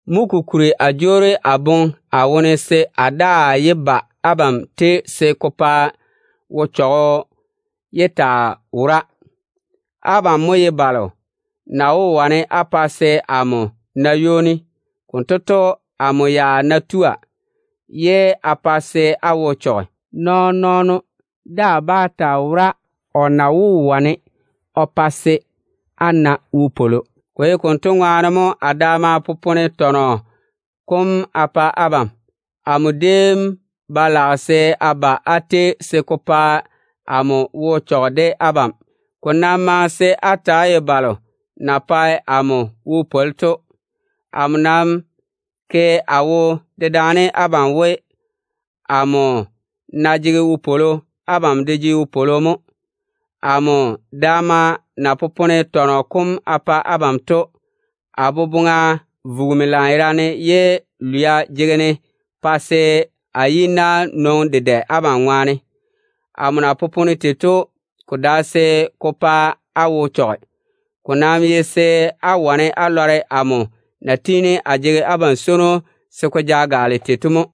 Mo kokuri a jwoori a boŋe a ja se a daa yé ba abam tei, se ko pa wo-chechɔgɔ yé taa wora. Abam mo ye balo na wó wane á pa se amo na ywoni. Konto to, amo ya ná tua, ye a pa se á wo chɔge, nɔɔn-nɔɔno daa bá taa wora o na wó wane o pa se a na wopwolo. Ko ye konto ŋwaane mo a daama popone tɔnɔ kom a pa abam. Amo déem ba lage se a ba á tei se ko pa amo wo chɔge abam ŋwaane. Ko nam maŋe se á ta‑á ye balo na pae amo wo pwoli to. Amo nam ke a wo dedaane abam we, amo ná jege wopwolo, abam de jege wopwolo mo. Amo daama na popone tɔnɔ kom a pa abam to, a boboŋa vugimi lanyerane, ye lwia jege-ne pa se a yi-na nwoŋi dedɛ abam ŋwaane. Amo na popone tei to, ko dae se ko pa á wo chɔge. Ko nam ye se á wane á lɔre amo na tiini a jege abam swono se ko ja gaale tei to mo.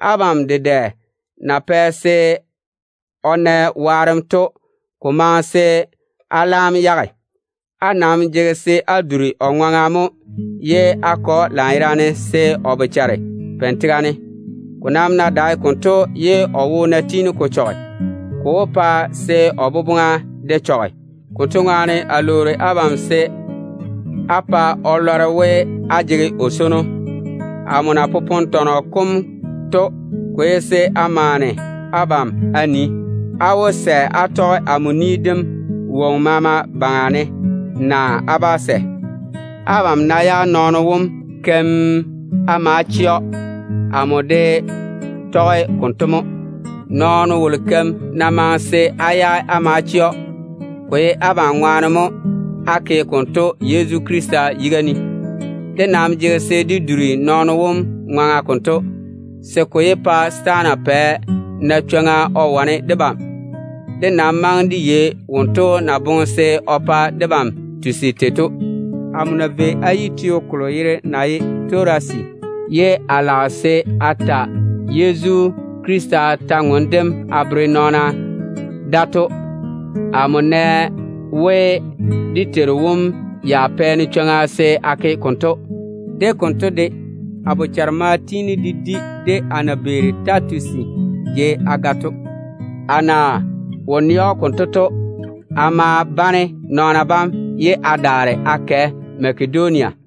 Abam dedɛ na pɛ se o na waarem to, ko maŋe se á laam yage. Á nam jege se á duri o ŋwaŋa mo ye á ke‑o lanyerane, se o bochare peini tega ne. Ko nam ná dae konto, ye o wo ná tiini ko chɔge, ko wó pa se o boboŋa de chɔge. Konto ŋwaane a lwoori abam se á pa kotu lɔre we, á jege o swono. Amo daama na popone tɔnɔ kom to, ko ye se a maane abam a nii, á wó sɛ á tɔge amo ni dem woŋo maama baŋa ne, naa á bá sɛ. Abam ná yage nɔɔno wolo keim á ma chɛ‑o, amo de tɔge konto mo. Nɔɔno wom za na ke kolo o chɔge to, amo yage a ma chɛ‑o. Ko nam ye abam ŋwaane mo a ke konto Yezu Krista yiga ne. Dé nam jege se de duri nɔɔno wom ŋwaŋa konto, se ko yé pa setaana pɛ na chwoŋa o wane debam. De nam maŋe de yei wonto na boŋe se o pa debam tusi tei to. Amo na vei a yi Torase, ye a lage se a tɔɔle Yezu Krista kwor-ywoŋa kam a bere nɔɔna da to, amo maane we dé Teiru wom ya pore chwoŋa se a ke konto. De konto de, a bochare ma tiini de di, de a na beeri Titusi jei a ga to. A na wo nɛ‑o konto to, a ma bane nɔɔna bam ye a daare a kɛ Makedonia.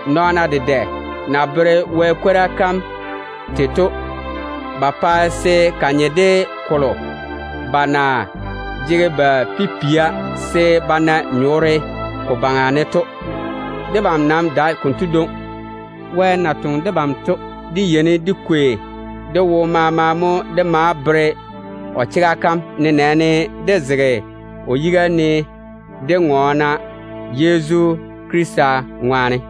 Nɔɔna dedɛ na bere Wɛ kwora kam tei to, ba pae se ko nye de kolo ba na jege ba pipia se ba na nyɔɔre ko baŋa ne to. Debam nam dae konto dwoŋi. Wɛ na toŋe debam to, dé yeini dé kwei dé wo maama mo dé maa bere o chega kam, nenɛɛne dé zege o yiga ne dé ŋɔɔna Yezu Krista ŋwaane.